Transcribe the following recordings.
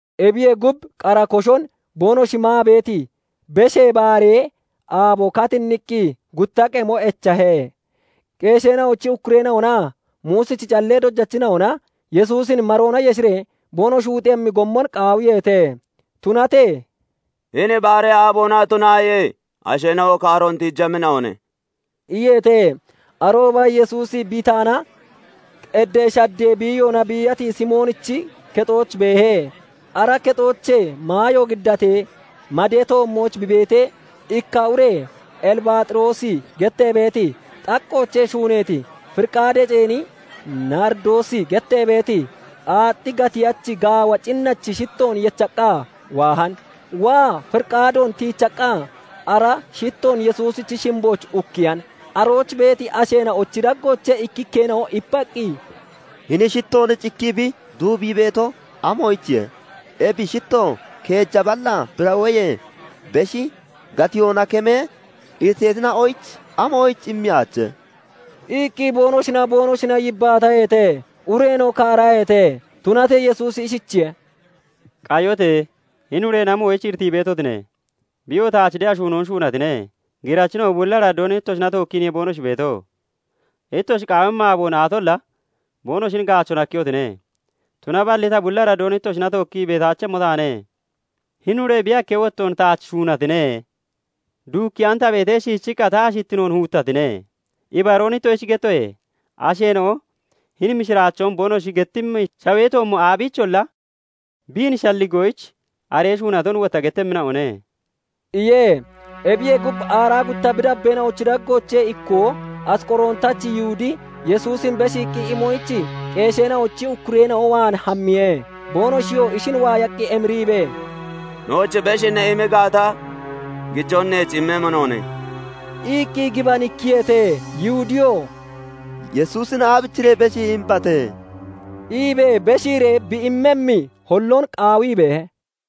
Ebiyee gub, qara koshon boonoshi maa beeti Beshee Baaree aabo katinniqqi gutta qemo echahe. Qeesheena'ochi ukkureena'onaa Muusichi callee dojachina'ona Yesuusin maroona yeshiree boonoshi wuxemmi gommon qaawiyeete. Tunatee "Hini baaree aaboona tunaaye; asheena'o kaaroon tiijemmina'one" iyeete. Arooba Yesuusi Bitaana, qeddee shaddee biiyoona biiyati Simoonichi kexooch beehe. Ara kexoochee maayo giddatee madee toommooch bi beetee, ikka ure elibaaxiroosi gettee beeti xaqqoochee shuuneeti firiqaadee ceeni Naaridoosi gettee beeti, aaxxi gatiyachi, gaawa cinnachi shittoon yechaqqa waahan. Waa firiqaadoon tiichaqqa ara shittoon Yesuusichi shimbooch ukkiyan. Arooch beeti asheena'ochi daggoochee ikkikkeena'o ipaqqi, "Hini shittoon cikkii bi duubii beeto amoyichiye? Ebi shitto keeja balla birawoyee beshi gatiyoona kemee iriteetina'oyich amoyich immeyaache?" iqqi boonoshinaa boonoshina yibbaataheete; ureenoo kaaraheete. Tunatee Yesuusi ishichiye:- "Qayote! Hini ureen amoyich iritii beetotine? Biyoo taach de'a shuunoon shuunatine. Girachina'o bulli araddoon ittoshina tookkiiniye boonoshi beeto; ittoshi qaawimmi aaboon aatolla boonoshin gaachoon hakkiyotine. Tunaballi ta bulli araddoon ittoshina tookki beetaachemmo taane. Hini ure bi hakkee wottoon taach shuunatine; duukkeyaan ta beetee shiichiqqa ta ashittinoon huuttatine. Ibaroon ittoshich gettoye; asheena'o hini mishiraachoon boonoshi gettimmii shawee toommo aabiicholla, biin shalligoyich are shuunaton wotta gettemmina'one" iye. Ebiyee gub, aaraa gutta bi dabbeena'ochi daggoochee ikkoo Asqorootachi Yihudi Yesuusin beshiiqqi imoyich, qeesheena'ochi ukkureena'o waan hammiye. Boonoshiyoo ishin waayaqqi emiriibee, "Nooch beshii ne imi gaata, gijoon neech immemmo noone" iqqi gibanikkiyeete. Yihudiyoo "Yesuusin aabichiree beshii imbate?" iibee beshiiree bi immemmi holloon qaawii beehe.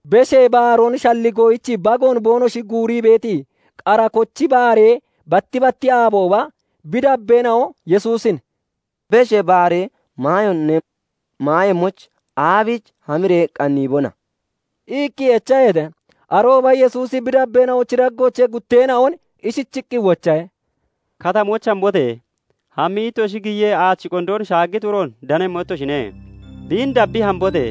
Beshee Baaroon shalligoyich, bagoon boonoshi guurii beeti qara kochi baaree batti batti aabooba, bi dabbeena'o Yesuusin "Beshee Baaree maayoon ne maayemmoyich aabiich hamiree qanniibona?" iqqi echaheete. Arooba Yesuusi bi dabbeena'ochi daggoochee gutteena'on ishichiqqi wochahe; "Katamooch hambote! Hammii ittoshi giyiyee, aachi qondoon shaaggiti uroon danemmo ittoshine; biin dabbi hambote!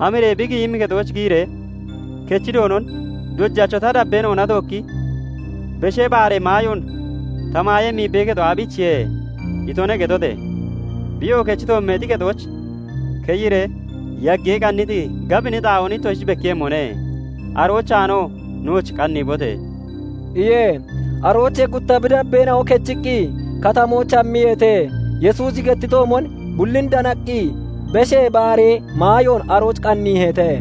Hamiree bi giyimmi kexooch giyiree kechi doonon 'Dojacho "Ta dabbeena'ona tookki Beshee Baaree maayoon ta maayemmi iibbee kexo aabichiye?" itone' getote! Biyoo kechi toommeexi kexooch keyiree yaggee qanniti gabini xaa'oon ittoshich bekkiiyemmone. Aroochaanoo nooch qanniibote!" iye. Aroochee gutta bi dabbeena'o kechiqqi katamooch hammiyeete. Yesuusi gettitoomon bullin danaqqi Beshee Baaree maayoon arooch qanniiheete.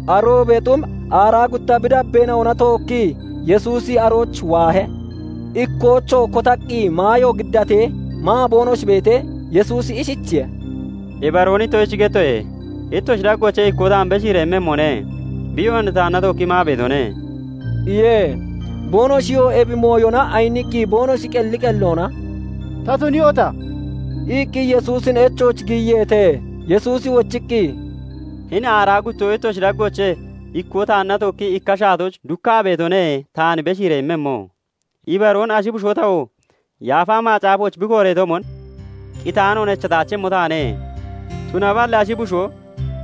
Aroobee xum aaraa gutta bi dabbeena'ona tookkii Yesuusi arooch waahe. Ikkoochoo kotaqqi maayo giddatee maa boonoshi beetee Yesuusi ishichiye:- "Ibaroon ittoshich gettoye; ittoshi daggoochee ikkoo taan beshiiree immemmone; biyoo and taanna tookkii maa beetone" iye. Boonoshiyoo ebi mooyona ayiniqqi boonoshi qelli qelloona "Ta tunehota?" iqqi Yesuusin echooch giyiyeete. Yesuusi wochiqqi, "Hini aaraa guttoo ittoshi daggoochee ikkoo taanna tookkii ikka shaatooch dukkaa beetone taan beshiiree immemmo. Ibaroon ashi bushoo tawoo Yaafa Macaafooch bi kooreetoomon qitaanoon echataachemmo taane; tunaballi ashi bushoo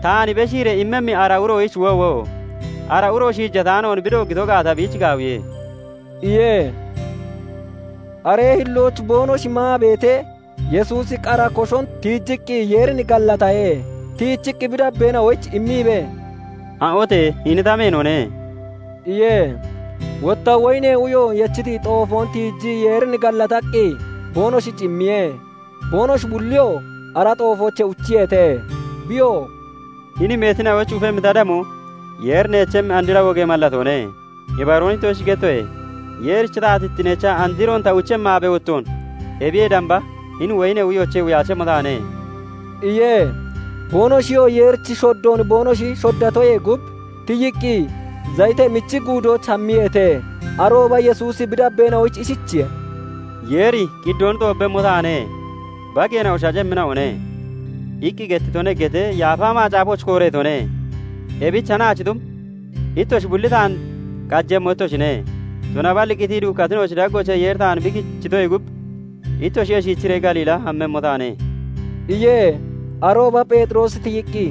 taan beshiiree immemmi ara uroyich woowo! Ara uro shiijataanoon bi dooggito gaata biich gaawiye" iye. Aree hillooch boonoshi maa beetee, Yesuusi qara koshon tiijiqqi Yeerin gallatahe; tiichiqqi bi dabbeena'oyich immiibee, "Ha'ote! Hini ta meenone" iye. Wotta woyinee uyo yechiti xoofoon tiijii Yeerin gallataqqi boonoshich immiye. Boonoshi bulliyoo ara xoofoochee uchiyeete. Biyoo "Hini meetina'oyich ufemmi ta damoo Yeeri neechemmi [andira] wogee mallatoone. Ibaroon ittoshich gettoye; Yeerichi taatittineecha androon ta uchemmi aabee wottoon ebiyee damba hini woyinee uyoochee uyaachemmo taane" iye. Boonoshiyoo Yeerich shoddoon boonoshi shoddatoyee gub tiyiqqi, Zayitee Michi Guudooch hammiyeete. Arooba Yesuusi bi dabbeena'oyich ishichiye:- " 'Yeeri "Qiddoon xoobbemmo taane; bageena'oo shacemmina'one" iqqi gettitone' getee Yaafa Macaafooch kooreetone. Ebich [hanaach xum] ittoshi bulli taan qajemmo ittoshine. Tunaballi qitii duukkatina'ochi daggoochee Yeeri taan bi kichitoyee gub, ittoshiyee shiichiree Galiilla hammemmo taane" iye. Arooba Pheexiroosi tiyiqqi,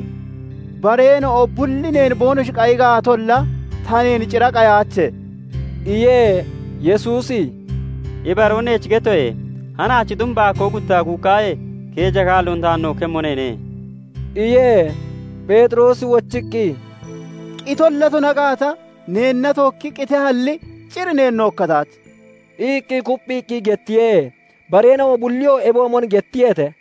"Bareena'o bulli neen boonoshi qayi gaatolla, ta neen cir qayaache" iye. Yesuusi "Ibaroon neech gettoye; hanaach xum baakkoo guttaa kuukkaahee, keeja kaalloon taan nookkemmo neene" iye. Pheexiroosi wochiqqi, "Qitolla tuna gaata, neenna tookki qitehalli cir neen nookkataache" iqqi kupphiiqqi gettiye. Bareena'o bulliyoo ebiyoomon gettiyeete.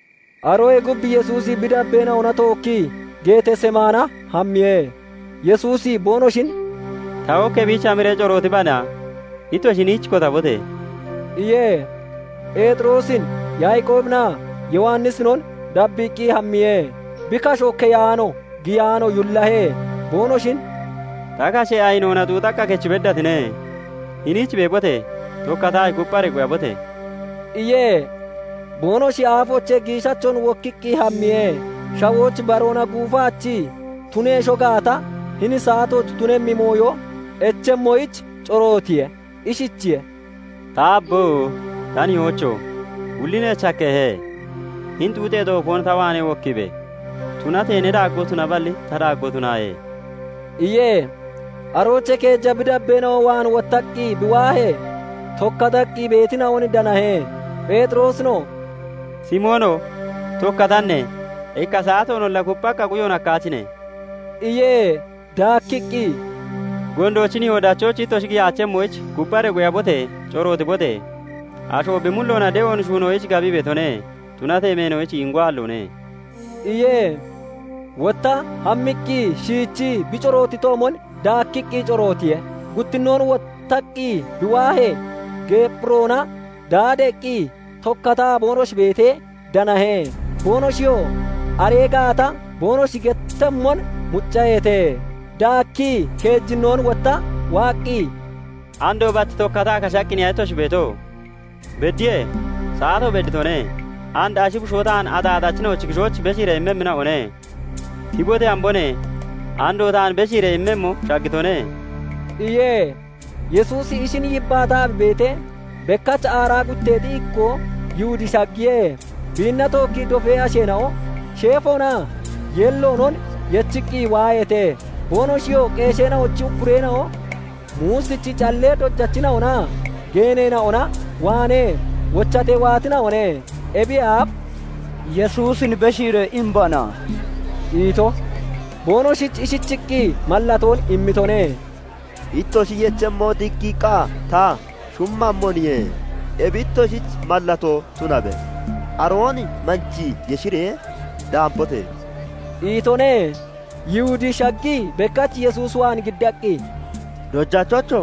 Aroyee gub Yesuusi bi dabbeena'ona tookkii Getesemaana hammiye. Yesuusi boonoshin "Ta ok ebiich hamiree corootibana; ittoshi hiniich kotabote!" iye. Pheexiroosin, Yaaqoobinaa Yowannisinon dabbiiqqi hammiye. Bi kasho keyaano giyaano yullahe. Boonoshin "Ta kashee ayinoona xuuxaqqa kech beddatine. Hiniich beebote! Tokkataayi kuppharee quyabote!" iye. Boonoshi aafoochee giishachoon wokkiqqi hammiye. Shawooch baroona guufaachii, tunesho gaata, hini saatooch tunemmi mooyo echemmoyich corootiye. Ishichiye:- "Taabo! Ta nihoocho! Bulli neech hakkeehe. Hini xuuxee xoofoon ta waanee wokkiibe! Tunatee ne daaggoo tunaballi, ta daaggoo tunaaye" iye. Aroochee keeja bi dabbeena'o waan wottaqqi bi waahee, tokkataqqi beetina'on danahe. Pheexiroosinoo "Simoono! Tokkatane? Ikka saatoonolla kupphaqqa quyoon hakkaachine?" iye. Daakkiqqi, "Gondoochi nihoo dachooch ittoshi giyaachemmoyich kuppharee quyabote! Corootibote! Asho bi mulloona de'oon shuunoyich gabii beetone; tunatee meenoyich yiingoo aalloone" iye. Wotta hammiqqi shiichii bi corootitoomon daakkiqqi corootiye. Guttinnoon wottaqqi bi waahee, gwwpphirona daadeeqqi tokkataa boonoshi beetee danahe. Boonoshiyoo aree gaata boonoshi gettemmon muccaheete. Daakkii keejinnoon wottaa waaqqi, "Andoo bat tokkataa kashaqqiniya ittoshi beeto? Beddiye; saato bedditone. And ashi bushoo taan axaaxachina'ochi kishooch beshiiree immemmina'one. Tibote! Hambone. Andoo taan beshiiree immemmo shaggitone" iye. Yesuusi ishin yibbaataa bi beetee, bekkach aaraa gutteexi ikkoo Yihudi shaggiye. Biinna tookkii dofee asheena'o sheefoonaa yeelloonon yechiqqi waaheete. Boonoshiyoo qeesheena'ochi ukkureena'o, Muusichi callee dojachina'onaa geeneena'ona waanee wochatee waatina'one. Ebiyee aaf "Yesuusin beshiiree imbana" ito, boonoshich ishichiqqi mallatoon immitone; "Ittoshi yechemmo, diggiiqqa ta shummammoniye. Ebi ittoshich mallatoo tunabe. Aroon manjii yeshiree daambote!" itone. Yihudi shaggii bekkach Yesuus waan giddaqqi, "Dojachocho!"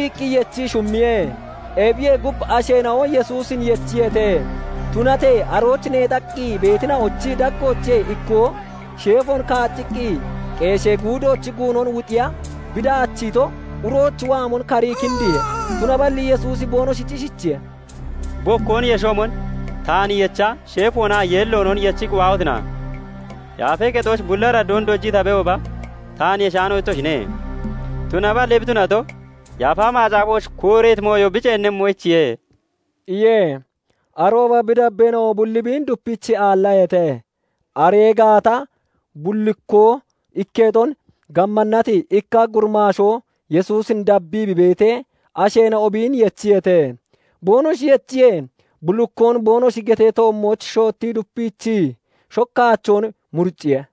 iqqi yechii shummiye. Ebiyee gub, asheena'o Yesuusin yechiyeete. Tunatee arooch neexaqqi beetina'ochi daggoochee ikkoo sheefoon kaacciqqi qeeshee guudoochi guunon wuxiya bi daachiito uroochi waamon karii kindiihe. Tunaballi Yesuusi boonoshich ishichiye:- "Bokkoon yeshoomon taan yecha sheefoonaa yeelloonon yechiqqi waahotina? Yaafee Kexooch bulli araddoon dojii ta beehooba taan yeshaano ittoshine. Tunaballi ebi tunato, Yaafa Macaafooch kooreeti mooyo bi ceenemmoyichiye" iye. Arooba bi dabbeena'o bulli biin dupiichii aallaheete. Aree gaata bullikkoo ikketon gammannati ikka gurimaashoo Yesuusin dabbii bi beetee, asheena'o biin yechiyeete. Boonoshi yechiyee, bullikkoon boonoshi getee toommooch shoottii dupiichii shokkaachoon muricciye.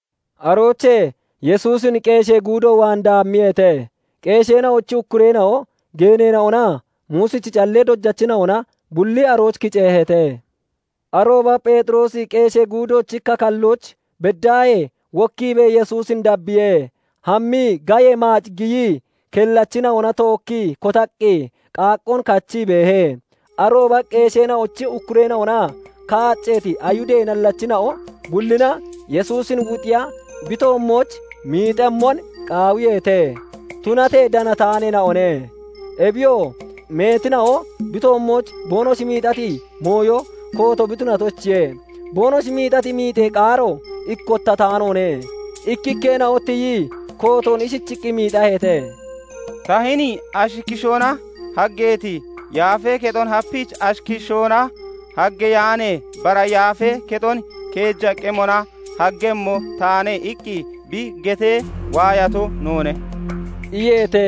Aroochee Yesuusin qeeshee guudo waan daammiyeete. Qeesheena'ochi ukkureena'o, geeneena'onaa Muusichi callee dojachina'ona bulli arooch kiceeheete. Arooba Pheexiroosi qeeshee guudoochi kakallooch beddaahee wokkiibee Yesuusin dabbiye. Hammii gayee maac giyii kellachina'ona tookkii kotaqqi qaaqqoon kachii beehe. Arooba qeesheena'ochi ukkureena'onaa kaacceeti Ayihudee nallachina'o bullina Yesuusin wuxiiya bi toommooch miixemmon qaawiyeete; tunatee danataaneena'one. Ebiyoo meetina'o bi toommooch boonoshi miixati mooyo kooto bi tunatoyichiye. Boonoshi miixati miixee qaaro ikkottataanoone. Ikkikkeena'o tiyii kootoon ishichiqqi miixaheete; "Ta hini ashi kishoona haggeeti yaafee kexon hapiich ashi kishoona haggeyaani bara yaafee kexon keeja qemona haggemmo taane' iqqi bi gettee waayato noone" iyeete.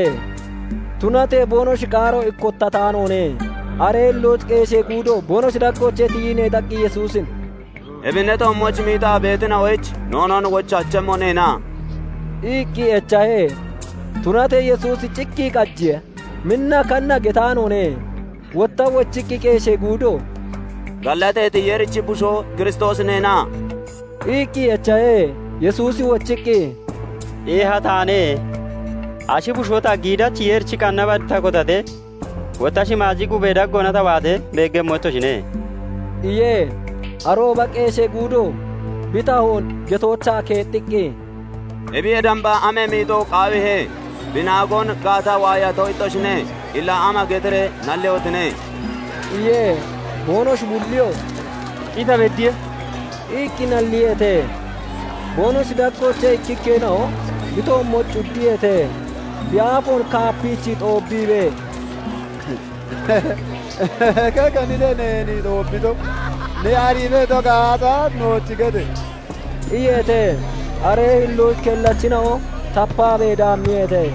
Tunatee boonoshi qaaro ikkottataanoone. Aree hillooch qeeshee guudo boonoshi daggoochee tiyii neexaqqi Yesuusin "Ebi ne toommooch miixaa beetina'oyich noonoo wochaachemmo neena?" iqqi echahe. Tunatee Yesuusi cikkii qajiye; minna kanna getaanoone. Wotta wochiqqi qeeshee guudo "Gallateeti Yeerichi Bushoo Kiristoosi neena?" iqqi echahe. Yesuusi wochiqqi, "Eeha taane. 'Ashi bushoo ta, giidachi Yeerichi qanna bad ta kotatee, wotta shimaaji qubee daggoona ta waatee' beeggemmo ittoshine" iye. Arooba qeeshee guudo bi tahoon getoochaa keexxiqqi, "Ebiyee damba amee miixoo qaawiihe? Bi naagon gaata, waayato ittoshine. Illa ama getiree nallehotine?" iye. Boonoshi bulliyoo "Qita beddiye" iqqi nalliyeete. Boonoshi daggoochee ikkikkeena'o bi toommooch cuddiyeete; bi aafoon kaapiichii xoobbiibee, "Eke konine neen xoobbito? Ne arii beeto gaata, nooch gete!" iyeete. Aree hillooch kellachina'o tapaabee daammiyeete.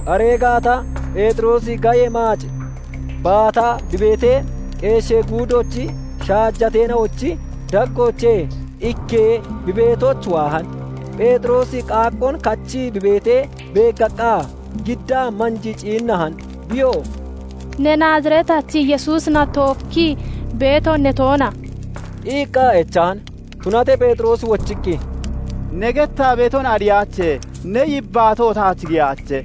Aree gaata Pheexiroosi gayee maac baata bi beetee, qeeshee guudoochi shaajateena'ochi daggoochee ikkee bi beetooch waahan. Pheexiroosi qaaqqoon kachii bi beetee beeggaqqa, giddaa manjii ciinnahan; biyoo "Ne Naazireetachi Yesuusina tookkii beeto ne toona?" iqqa echan. Tunatee Pheexiroosi wochiqqi, "Ne gettaa beeton ariyaache; ne yibbaatoo taach giyaache"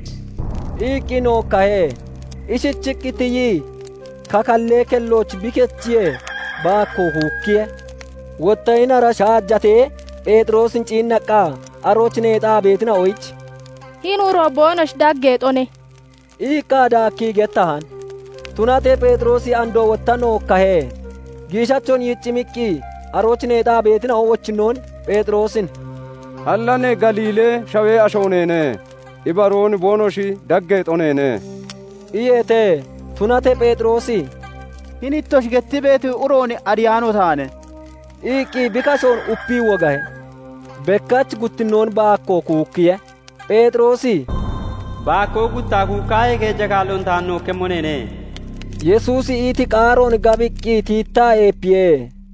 iqqi nookkahe. Ishichiqqi tiyii kakallee kellooch bi kechiyee, [baakkoo kuukkiye]. Wotta hini ara shaajatee Pheexiroosin ciinnaqqa arooch neexaa beetina'oyich "Hini uro boonoshi daggeexone" iqqa daakkii gettahan. Tunatee Pheexiroosi andoo wotta nookkahe. Giishachoon yiccimmiqqi arooch neexaa beetina'o wochinnoon Pheexiroosin "Halla ne Galiilee shawee asho neene. Ibaroon boonoshi daggeexo neene" iyeete. Tunatee Pheexiroosi "Hini ittoshi gettii beeti uroon ariyaano taane" iqqi bi kashoon upii wogahe. Bekkach guttinnoon baakkoo kuukkiye. Pheexiroosi "Baakkoo guttaa kuukkaahee keeja kaalloon taan nookkemmo neene" Yesuusi iti qaaroon gabiqqi tiittaa eepiye.